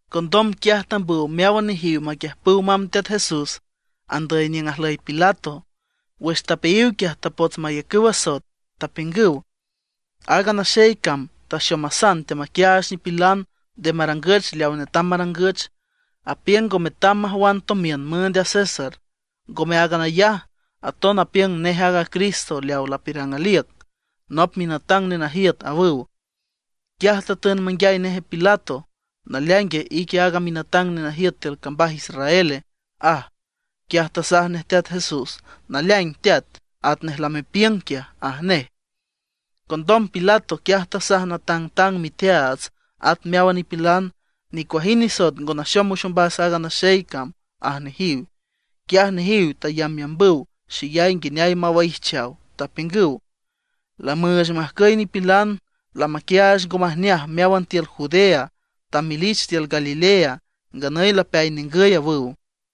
Condom quiaj tambüw meáwan nejiw maquiüjpüw mamb Teat Jesús andüy niüng ajlüy a Pilato. Wüx tapeayiw quiaj tapots mayacüw asoet, tapiüngüw: ―Aaga naxey cam taxomasan teamaquiaach nipilan nde marangüch leaw netam marangüch. Apiüng ngo metam majwan tomiün müünd a César. Ngome áagan ayaj, aton apiüng nej aaga Cristo leaw lapiürang aliüc, nop minatang nenajiüt ―awüw. Quiaj tatün manguiay nej a Pilato: ―¿Naleaingue, ique aaga minatang nenajiüt tiül cambaj Israele? ―aj. Quiaj tasaj nej Teat Jesús: ―Naleaing teat, atnej lamepiüng quiaj ―aj nej. Condom Pilato quiaj tasaj natangtang miteaats at meáwan nipilan: ―Nicuajind nisoet ngo naxom wüx ombas aaga naxey cam ―aj nejiw. Quiaj nejiw tayambyambüw xeyay nguineay mawaijchaw, tapiüngüw: ―Lamüüch majcüy nipilan, lamaquiaach ngo majneaj meáwan tiül Judea, tamelich tiül Galilea, nganüy lapeay ningüy ―awüw.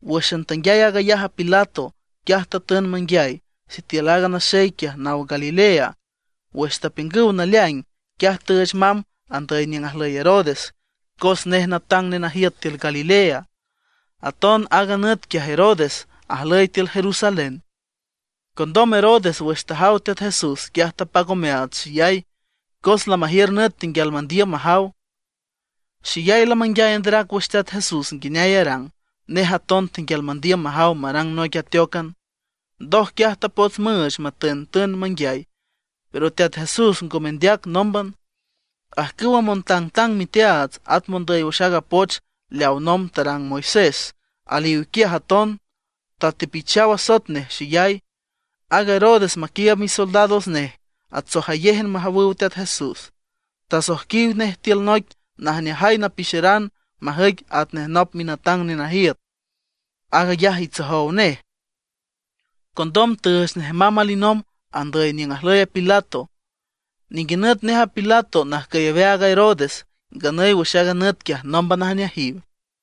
Wǘxan tanguiay aag ayaj a Pilato, quiaj tatün manguiay sitiül aaga naxey quiaj naw Galilea. Wüx tapiüngüw naleaing, quiaj tüüch mamb andüy niüng ajlüy a Herodes, cos nej natang nenajiüt tiül Galilea. Aton aaga nüt quiaj Herodes ajlüy tiül Jerusalén. Condom Herodes wüx tajaw Teat Jesús, quiaj tapac omeaats xeyay, cos lamajiür nüt tenguial mandiüm majaw. Xeyay lamanguiay anderac wüx Teat Jesús nguineay arang. Nej aton tenguial mandiüm majaw marang noic ateócan. Ndoj quiaj tapots müüch matüntün manguiay; pero Teat Jesús ngo mendeac nómban. Ajcüwa montangtang miteaats, at mondüy wüx aaga poch leaw nomb tarang a Moisés, aliw quiaj aton; tatepichaw asoet nej xeyay. Aaga Herodes maquiiüb misoldados nej atsojayéjan majawüw Teat Jesús. Tasoijquiw nej tiül noic najneajay napixeran majüic atnej nop minatang nenajiüt. Aag ayaj itsojow nej. Condom tüüch nej mamb alinomb andüy niüng ajlüy a Pilato. Ninguinüt nej a Pilato najcüy aweaag a Herodes; nganüy wüx aaga nüt quiaj nómban ajneajiw.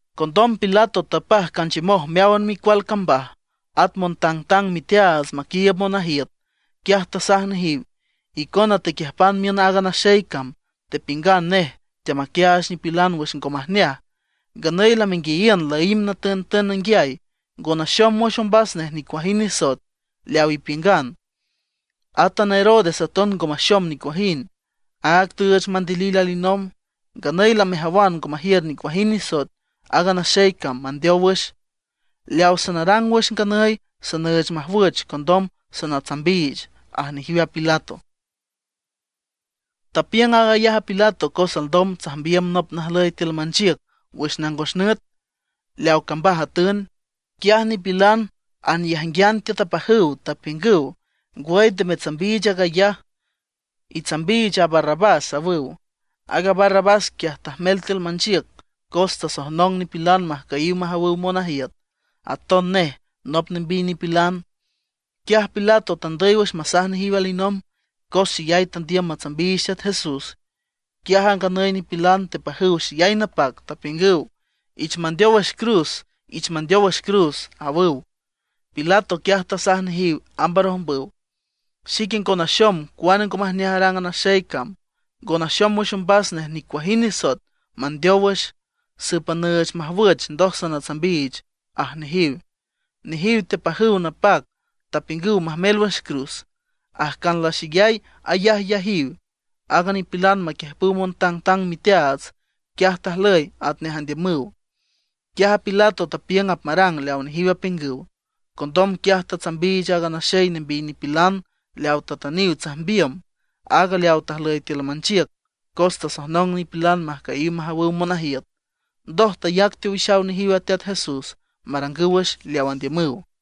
Condom Pilato tapaj canchiümoj meáwan micual cambaj, at montangtang miteaats maquiiüb monajiüt. Quiaj tasaj nejiw: ―Icona tequiüjpan miün aaga naxey cam. Tepiüngan nej teamaquiaach nipilan wüx ngo majneaj. Nganüy lamenguiayiün laímb natüntün nanguiay, ngo naxom wüx ombas nej nicuajind nisoet leaw ipiüngan. Átan a Herodes aton ngo maxom nicuajind, áag tüüch mandilil alinomb. Nganüy lamejawan ngo majiür nicuajind nisoet aaga naxey cam mandeow wüx. Leaw sanarang wüx nganüy, sanüüch majwüch, condom sanatsambiich ―aj nejiw a Pilato. Tapiüng aag ayaj Pilato cos alndom tsajmbiüm nop najlüy tiül manchiüc wüx nangos nüt, leawa cambaj atün. Quiaj nipilan anyajnguian tiüt apajüw, tapiüngüw: ―¡Ngwüy nde metsambiich aag ayaj! ¡Itsambiich a Barrabás! ―awüw. Aaga Barrabás quiaj, tajmel tiül manchiüc cos tasojnong nipilan majcüyiw majawüw monajiüt; aton nej nop nembiy nipilan. Quiaj Pilato tandüy wüx masaj nejiw alinomb, cos xeyay tandiüm matsambiich Teat Jesús. Quiaj a nganüy nipilan tepajüw xeyay napac, tapiüngüw: ―¡Ich mandeow wüx cruz, ich mandeow wüx cruz! ―awüw. Pilato quiaj tasaj nejiw amb arojmbüw: ―Xique ngo naxom cuane ngo majneaj arang aaga naxey cam. Ngo naxom wüx ombas nej nicuajind nisoet mandeow wüx. Sǘpan nüüch majwüch, ndoj sanatsambiich ―aj nejiw. Nejiw tepajüw napac, tapiüngüw majmel wüx cruz. Ajcan laxeyay ayajyajiw a nipilan maquiüjpüw montangtang miteaats, quiaj tajlüy atnej andiümüw. Quiaj Pilato tapiüng apmarang leawa nejiw apiüngüw. Condom quiaj tatsambiich aaga naxey nembiy nipilan leaw tatüniw tsajmbiüm, áag leaw tajlüy tiül manchiüc cos tasojnong nipilan majcüyiw majawüw monajiüt. Ndoj tayac teowixaw nejiw a Teat Jesús marangüw wüx leaw andiümüw.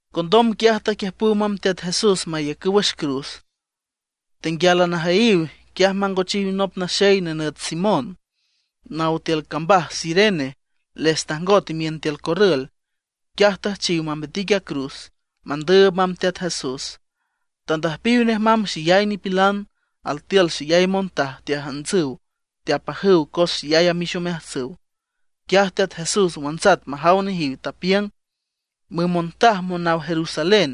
Condom quiaj taquiüjpüw mamb Teat Jesús mayacüw wüx cruz. Tenguiálan ajüyiw, quiaj mangochiw nop naxey nenüt Simón, naw tiül cambaj Cirene, les tajngot imiün tiül corrül. Quiaj tüjchiw mambitic a cruz, mandüüb mamb Teat Jesús. Tandüjpiw nej mamb xeyay nipilan. Altiül xeyay montaj teajiüntsüw teapajüw cos xeyay amix omeajtsüw. Quiaj Teat Jesús wantsat majaw nejiw, tapiüng: ―Müm montaj monaw Jerusalén,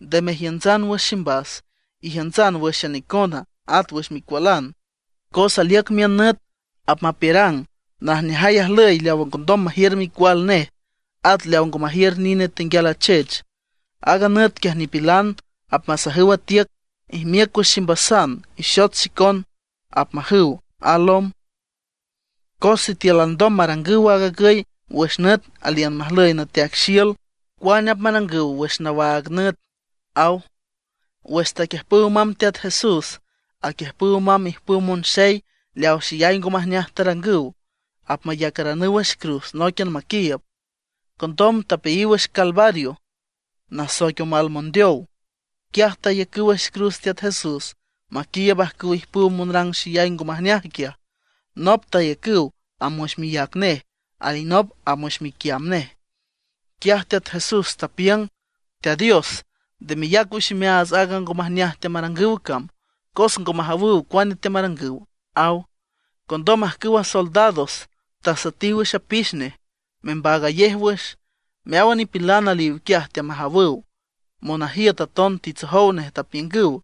nde mejiüntsan wüx ximbas, ijiüntsan wǘxan icona, at wüx micualan. Cos aliüc miün nüt apmapiürang: “Najneajay ajlüy leaw ngondom majiür micual nej, at leaw ngo majiür nine tenguial achech.” Aaga nüt quiaj nipilan apmasajüw a tiüc: “Ijmiüc wüx ximbasan, ixot xicon”, apmajüw a lom. Cos sitiül alndom marangüw aag agüy wüx nüt aliün majlüy nateaic xiül, ¿cuane apmarangüw wüx nawaag nüt? ―aw. Wüx taquiüjpüw mamb Teat Jesús, aquiüjpüw mamb ijpüw monxey leaw xeyay ngo majneaj tarangüw; apmayacaranüw wüx cruz nóiquian maquiiüb. Condom tapeayiw wüx Calvario, nasoic Omal Mondeow, quiaj tayacüw wüx cruz Teat Jesús maquiiüb ajcüw ijpüw monrang xeyay ngo majneaj quiaj. Nop tayacüw amb wüx miác nej, alinop amb wüx miquiamb nej. Quiaj Teat Jesús tapiüng: ―Teat Dios, nde meyac wüx imeaats aaga ngo majneaj teamarangüw cam, cos ngo majawüw cuane teamarangüw ―aw. Condom ajcüwa soldados tasuetiw wüx apix nej, membaagayej wüx. Meáwan nipilan aliw quiaj teamajawüw. Monajiüt aton titsojow nej, tapiüngüw: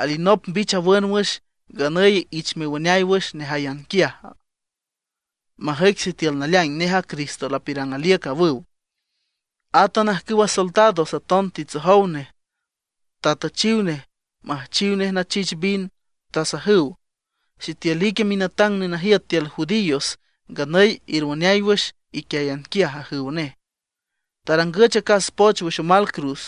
―Alinop mbich awün wüx; nganüy ich mewüneay wüx nejáyan quiaj, majüic sitiül naleaing nej aaga Cristo lapiürang aliüc ―awüw. Átan ajcüwa soldados aton titsojow nej, tatüchiw nej müjchiw nachich vin. Tasajüw: ―Sitiül ique minatang nenajiüt tiül judíos, nganüy erwüneay wüx iquiáyan quiaj ―ajüw nej. Tarangüch acas poch wüx omal cruz.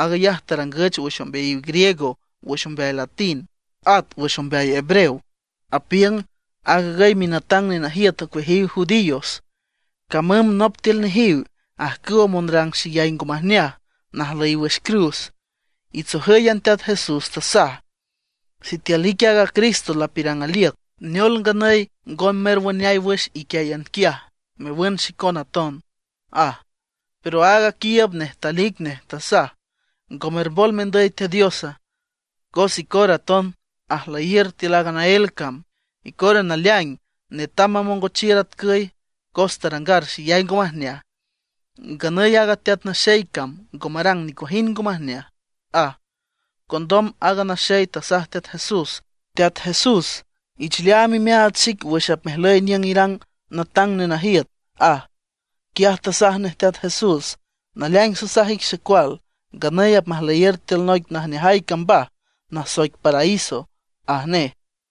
Aag ayaj tarangüch wüx ombeayiw griego, wüx ombeay latín, at wüx ombeay hebreo. Apiüng: “Aag agüy minatang nenajiüt ocueajiw judíos.” Camüm nop tiül nejiw ajcüwa monrang xeyay ngo majneaj najlüyiw wüx cruz, itsojǘyan Teat Jesús, tasaj: ―Sitiül ique aaga Cristo lapiürang aliüc, ¿neol nganüy ngo merwüneay wüx iquiáyan quiaj, mewün xicon aton? ―aj. Pero aag aquiiüb nej talic nej, tasaj: ―¿Ngo mermbol mendüy Teat Diosa? Cos icora aton ajlüyiür tiül aaga naél cam. Icora naleaing netam mamongochiür atcüy, cos tarangar xeyay ngo majneaj. Nganüy aaga teat naxey cam ngo marang nicuajind ngo majneaj ―aj. Condom aaga naxey tasaj Teat Jesús: ―Teat Jesús, ich leaam imeaats xic wüx apmejlüy niüng irang natang nenajiüt ―aj. Quiaj tasaj nej Teat Jesús: ―Naleaing sasaj ic xecual, nganüy apmajlüyiür tiül noic najneajay cambaj nasoic paraíso ―aj nej.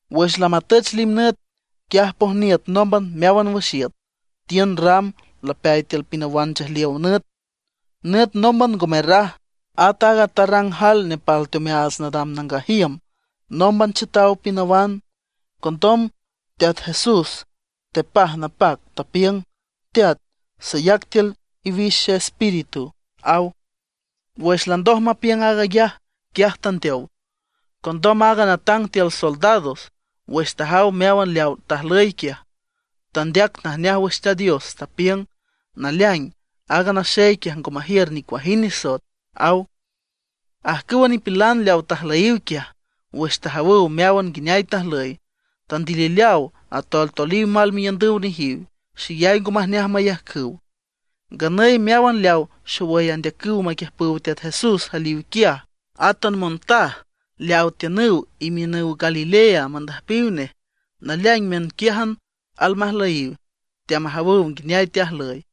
Wüx lamatüch limnüt, quiaj pojniüt nómban meáwan wüx iüt. Tiün ram lapeay tiül pinawan nchejliow nüt. Nüt nómban ngo merraj, at aaga tarrang jael nepal teomeaats nadam nangaj iüm nómban chiütaw pinawan. Condom Teat Jesús tepaj napac, tapiüng: ―Teat, sayac tiül iwix xeespíritu ―aw. Wüx landoj mapiüng aag ayaj, quiaj tandeow. Condom aaga natang tiül soldados, wüx tajaw meáwan leawa tajlüy quiaj, tandeac najneaj wüx Teat Dios, tapiüng: ―Naleaing, aaga naxey quiaj ngo majiür nicuajind nisoet ―aw. Ajcüwa nipilan leaw tajlüyiw quiaj, wüx tajawüw meáwan nguineay tajlüy, tandilileaw atoltoliw mal miiündüw nejiw; xeyay ngo majneaj mayajcüw. Nganüy meáwan leaw xowüy andeacüw maquiüjpüw Teat Jesús aliw quiaj, átan montaj leawa tiünüw imiünüw Galilea mandüjpiw nej. Naleaing miünquiájan almajlüyiw, teamajawüw nguineay teajlüy.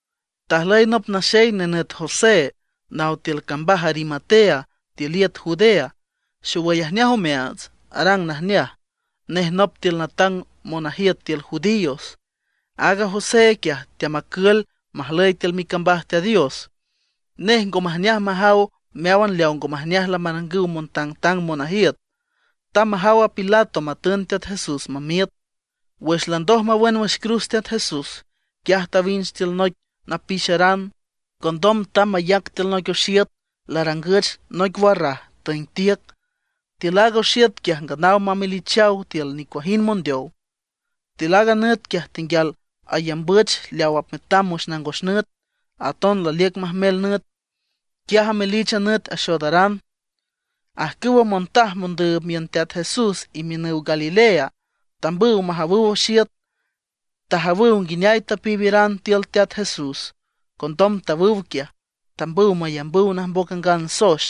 Tajlüy nop naxey nenüt José, naw tiül cambaj Arimatea tiül iüt Judea, xowüy ajneaj omeaats, arang najneaj. Nej nop tiül natang monajiüt tiül judíos. Aaga José quiaj teamacül majlüy tiül micambaj Teat Dios. Nej ngo majneaj majaw meáwan leawa ngo majneaj lamarangüw montangtang monajiüt. Tamb majaw a Pilato matün Teat Jesús mamiüt. Wüx landoj mawün wüx cruz Teat Jesús, quiaj tawinch tiül noic napixeran. Condom tamb mayac tiül noic oxiüt larangüch noic warraj tüeng tiüc. Tiül aaga oxiüt quiaj nganaw mamelichaw tiül nicuajind mondeow. Tiül aaga nüt quiaj tenguial ayambüch leaw apmetam wüx nangos nüt, aton laliüc majmel nüt, quiaj amelich a nüt axoodaran. Ajcüwa montaj mondüüb miün Teat Jesús imiünüw Galilea, tambüw majawüw oxiüt. Tajawüw nguineay tapiiberan tiül a Teat Jesús. Condom tawüw quiaj, tambüw mayambüw najmboc angan soex,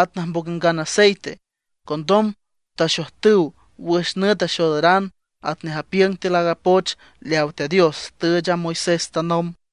at najmboc angan aceite. Condom taxojtüw wüx nüt axoodaran atnej apiüng tiül aaga poch leawa Teat Dios tüüch a Moisés tanomb.